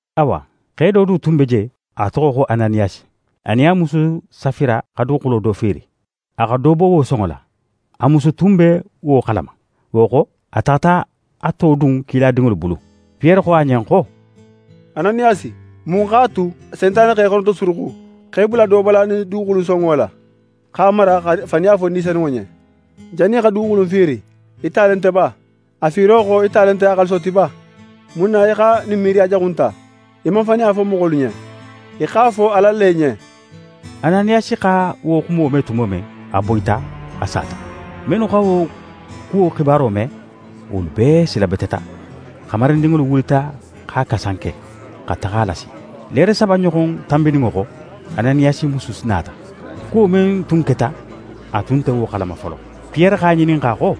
Awa, xe do du tun be je, a toxo xo Ananiyasi. A nin a musu Safira xa duguxulo do fiiri. A xa do bo wo sonŋo la. A musu tun be wo xalama. Wo xo, a taxata a to dun kiladinŋolu bulu. Piyere xo a ɲen xo: «Ananiyasi, mun x'a tu Sentane xa í xonotosuruxu x'é bula do bola ɲin duguxulu in sonŋo la, x'a mara, xa faniya fo Ni Senunŋo ɲen? Jannin í xa duguxulu in fiiri, í ta le nte ba? A fiiro xo, í ta le nte a xaaliso ti ba? Mun na í xa ɲin miiriya jaxu in ta? Í man faniya fo moxolu ɲen, í x'a fo Ala le ɲen.» Ananiyasi xa wo xumo me tumo men, a boyita, a sata. Mennu xa wo kuwo xibaro me, wolu bee silabeteta. Xamarindinŋolu wulita x'a kasanke, xa taxa a lasi. Leere saba ɲoxon tanbininŋo xo, Ananiyasi musu nata. Kuwo men tun keta, a tun nte wo xalama folo. Piyere x'a ŋininxa xo: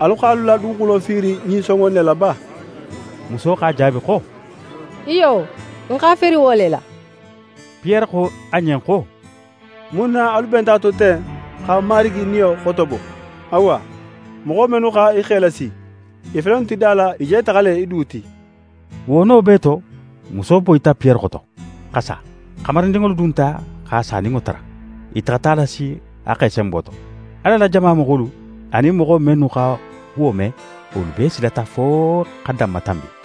«Alu x'alu la duguxulo fiiri ɲin sonŋo in ne la ba?» Muso x'a jaabi xo: «Iyo, n x'a fiiri wo le la.» Piyere xo a ɲen xo: «Mun na alu benta a to ten xa Marigi Niyo xotobo? Awa, moxo mennu xa í xe lasi, i fele innu ti da la; i je taxa le í du ti.» Wo no bee to, muso boyita Piyere xoto, xa sa. Xamarindinŋolu dunta x'a saninŋo tara. I taxata a lasi a xe senbo to. Ala la jama moxolu, anin moxo mennu xa wo me, wolu bee silata fo xa danmatanbi.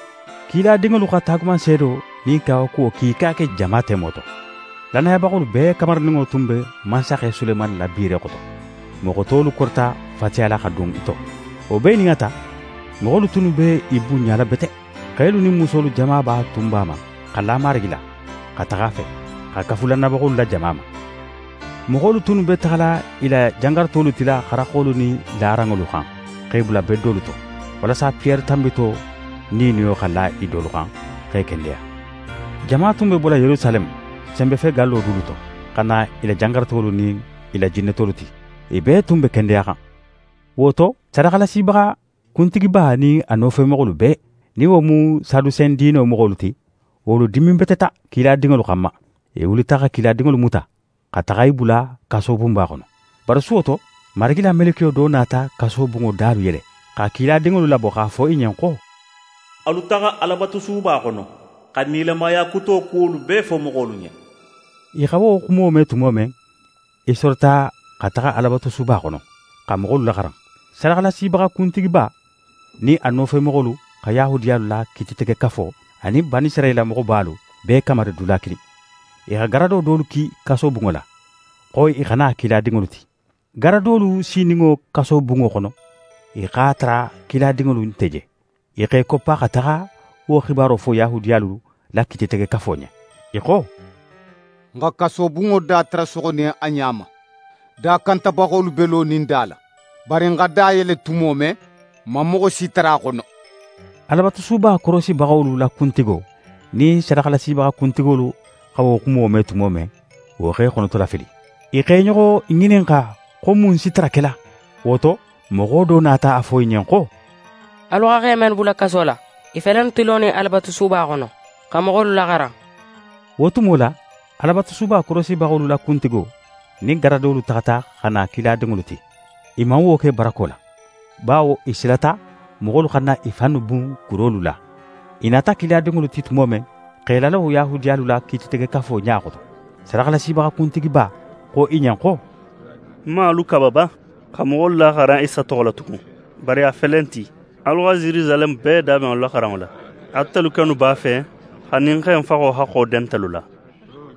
Kiladinŋolu xa taagumanseedo nin kawakuwo kiika ke jama temo to. Lannayabaxolu bee kamarininŋo tun be mansaxe Sulemani la biire xoto. Moxo tolu korita fatiyala xa dun i to. Wo bee nin a ta, moxolu tunnu be i bunɲala bete. Xelu nin musolu jamaba tun b'a ma xa la Marigi la xa taxa a fe, xa kafu lannayabaxolu la jama ma. Moxolu tunnu be taxala i la jangarutolu tila xaraxolu nin laranŋolu xan, x'e bula bedolu to, walasa Piyere tanbito niiniyo xa la i dolu xan, x'e kendeya. Jama tun be bola Yerusaleme senbefegallo dulu to, xa na i la jangarutolu nin i la jinnetolu ti. I bee tun be kendeyaxan. Wo to, sadaxalasibaxa kuntigiba nin a nofemoxolu bee, nin wo mu Sadusen diino moxolu ti, wolu diminbeteta kiladinŋolu xanma. I wulita xa kiladinŋolu muta, xa taxa i bula kasobunba xono. Bari suwo to, Marigi la melekiyo do nata kasobunŋo dalu yele, xa kiladinŋolu labo x'a fo i ɲen xo: «Alu taxa Alabatusuba xono, xa nilamaya kuto kuwolu bee fo moxolu ɲen.» I xa wo xumo me tumo men, i sorita xa taxa Alabatusuba xono, xa moxolu laxaran. Sadaxalasibaxa kuntigiba nin a nofemoxolu xa Yahudiyalu la Kiititegekafo, anin Banisirayila moxobalu bee kamari dula kilin. I xa garado dolu ki kasobunŋo la, xo i xa na kiladinŋolu ti. Garadolu sininŋo kasobunŋo xono, i x'a tara kiladinŋolu nte je. I x'e koppa xa taxa wo xibaro fo Yahudiyalu la Kiititegekafo ɲen. I xo: «N xa kasobunŋo da tara soxonin a ɲa ma. Dakantabaxolu be lonin da la. Bari n xa da yele tumo men, n man moxo si tara a xono.» Alabatusuba korosibaxolu la kuntigo nin sadaxalasibaxa kuntigolu xa wo xumo me tumo men, wo x'e xonotolafili. I x'e ɲoxo ŋininxa xo mun si tara kela. Wo to, moxo do nata a fo i ɲen xo: «Alu xa xe mennu bula kaso la, i fele innu ti lonin Alabatusuba xono, xa moxolu laxaran.» Wo tumo la, Alabatusuba korosibaxolu la kuntigo nin garadolu taxata xa na kiladinŋolu ti. I man wo ke barako la, bawo i silata moxolu xana i fannu bun kurolu la. I nata kiladinŋolu ti tumo men, x'e lalo Yahudiyalu la Kiititegekafo ɲa xoto. Sadaxalasibaxa kuntigiba xo i ɲen xo: «N man alu kaba ba, xa moxolu laxaran Isa toxo la tugun? Bari a fele in ti, alu xa Yerusaleme bee daben alu la xaranŋo la. Atelu kennu b'a fe xa ɲin xe in faxo haxxo den ntelu la.»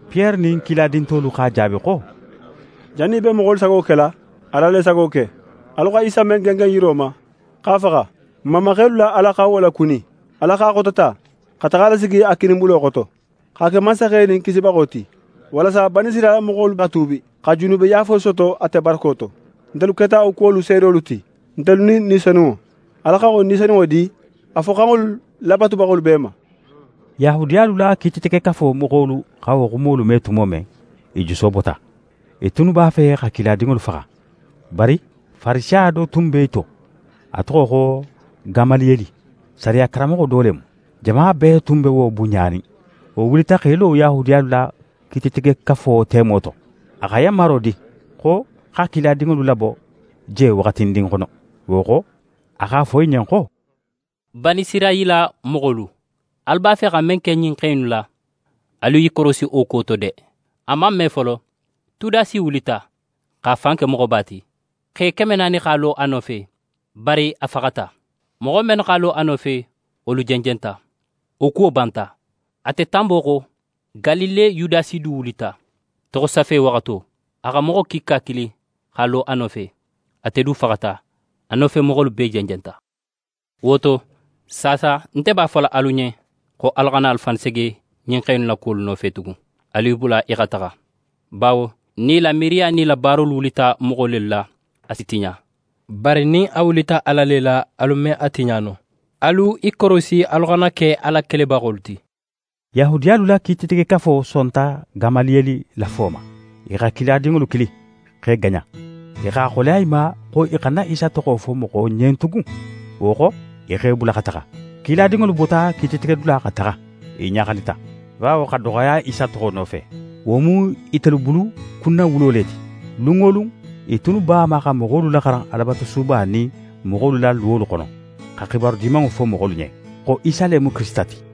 Piyere nin kiladin tolu x'a jaabi xo: «Jannin í be moxolu sago kela, Ala le sago ke. Alu xa Isa men gengen yiro ma, x'a faxa, n mamaxelu la Ala xa wo lakuni. Ala x'a xotota, xa taxa a lasigi a kininbulo xoto, x'a ke Mansaxe nin Kisibaxo ti, walasa Banisirayila moxolu xa tuubi, xa junubeyaafo soto ate barako to. Ntelu keta wo kuwolu seedolu ti, ntelu nin Ni Senunŋo. Ala xa wo Ni Senunŋo di a foxanŋolu labatubaxolu bee ma.» Yahudiyalu la Kiititegekafo moxolu xa wo xumolu me tumo men, i juso bota. I tunnu b'a fe xa kiladinŋolu faxa. Bari Farisiya do tun be i to, a toxo xo Gamaliyeli, sariya karanmoxo do le mu. Jama bee tun be wo bunɲanin. Wo wulita x'é lo Yahudiyalu la Kiititegekafo temo to. A xa yanmaro di, xo xa kiladinŋolu labo je waxatindin xono. Wo xo, a x'a fo i ɲen xo: «Banisirayila moxolu, alu b'a fe xa men ke ɲin xe innu la, alu i korosi wo kuwo to de! A man me folo, Tudasi wulita, x'a fan ke moxoba ti. Xe keme naani x'a lo a nofe. Bari a faxata. Moxo mennu x'a lo a nofe, wolu jenjenta. Wo kuwo banta. Ate tanbo xo, Galile Yudasi du wulita, toxosafe waxato. A xa moxo kiika kili x'a lo a nofe. Ate du faxata. A nofemoxolu bee jenjenta. Wo to, saasa nte b'a fola alu ɲen xo alu xana alu fannu sege ɲin xe innu la kuwolu nofe tugun. Alu i bula i xa taxa, bawo nin i miiriya nin i la baaro wulita moxo lelu la, a si tiɲa. Bari nin a wulita Ala le la, alu me a tiɲa no. Alu i korosi alu xana ke Ala kelebaxolu ti.» Yahudiyalu la Kiititegekafo sonta Gamaliyeli la fo ma. I xa kiladinŋolu kili, x'e gaɲa. I x'a xoleya i ma xo i xana Isa toxo fo moxo ɲen tugun. Wo xo, i x'e bula xa taxa. Kiladinŋolu bota kiititegedula xa taxa. I ɲaxalita, bawo xa doxoya Isa toxo nofe, wo mu itelu bulu kunnawulo le ti. Lun wo lun, i tunnu b'a ma xa moxolu laxaran Alabatusuba nin moxolu la luwolu xono, xa xibaru Dimanŋo fo moxolu ɲen, xo Isa le mu Kirisita ti.